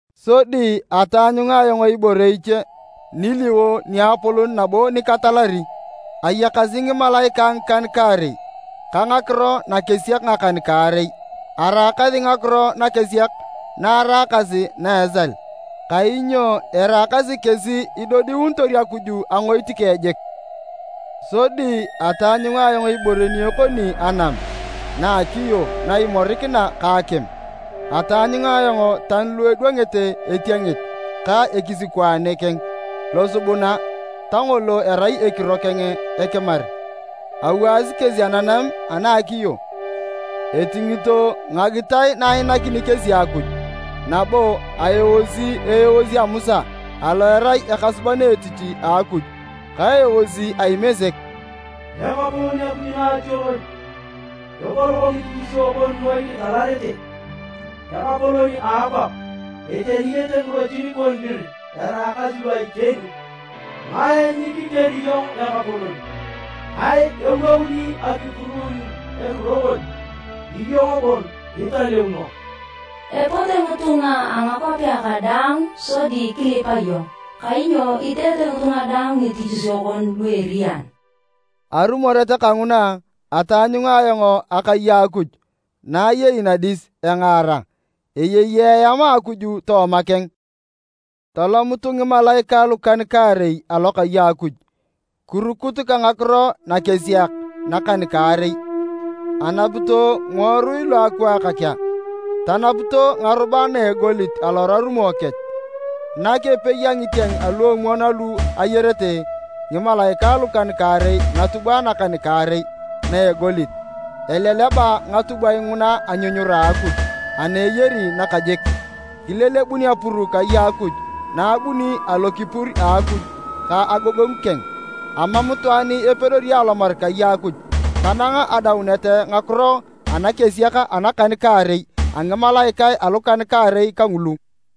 Sodi ataanyunga ayong ibore iche niliwo niapolon nabo nikitalari. Ayakasi ngimalaikae ngikan-kaarei ka ngakiro nakesiak ngakan-kaarei. Araakasi ngakiro nakesiak na araakasi na a esal, kainyo eraakasi kesi idodiunitor Akuj angoit keng jik. Sodi ataanyunga ayong ibore ni ekoni anam na a akiyo na imorikina ka akim. Ataanyunga ayong tani lu edwangete etiengit ka ekisikwaane keng losubuna ta ngolo erai ekiro keng ekimar. Awaasi kesi ananam ana a akiyo, etingito ngagitae na ainakini kesi Akuj nabo aeosi eeos a Musa alo erai ekasuban etich a Akuj, ka eeos a Imesek: “Ekapolon Akuj Naationon, epolok ngitichisio kon noi kitalarete! Ekapolon a akwap, eteniyete ngirotin kon dir eraakasi lu a iteni! Ngae nyikikeri iyong Ekapolon? Ngae ewouni akipuruun ekiro kon? Iyong bon italeuno. Epote ngitunga a ngakwapea kadaang sodi kilipa iyong, kainyo iteete ngitunga daang ngitichisio kon lu eriyan.” Arumoret kanguna, ataanyunga ayong akai a Akuj na eyei nadis engaar, eyei eam a Akuj tooma keng. Tolomut ngimalaikae lukan-kaarei alokai a Akuj, kirukut ka ngakiro nakesiak nakan-kaarei. Anapito ngiworui lu akwaak kea tanapito ngarubae na a egolit alorarumo kech. Nak epei a ngitieng aluomwon alu ayarete ngimalaikae lukan-kaarei ngatubwae nakan-kaarei na a egolit. Eleleba ngatubwae nguna anyunyura a Akuj ana eyari nakajik. Kilelebun apuru kai a Akuj na abuni alokipur a Akuj ka agogongu keng. Amam itwaan epedori alomar kai a Akuj tanang adaunet a ngakiro anakesiak anakan-kaarei a ngimalaikae alukan-kaarei kangulu.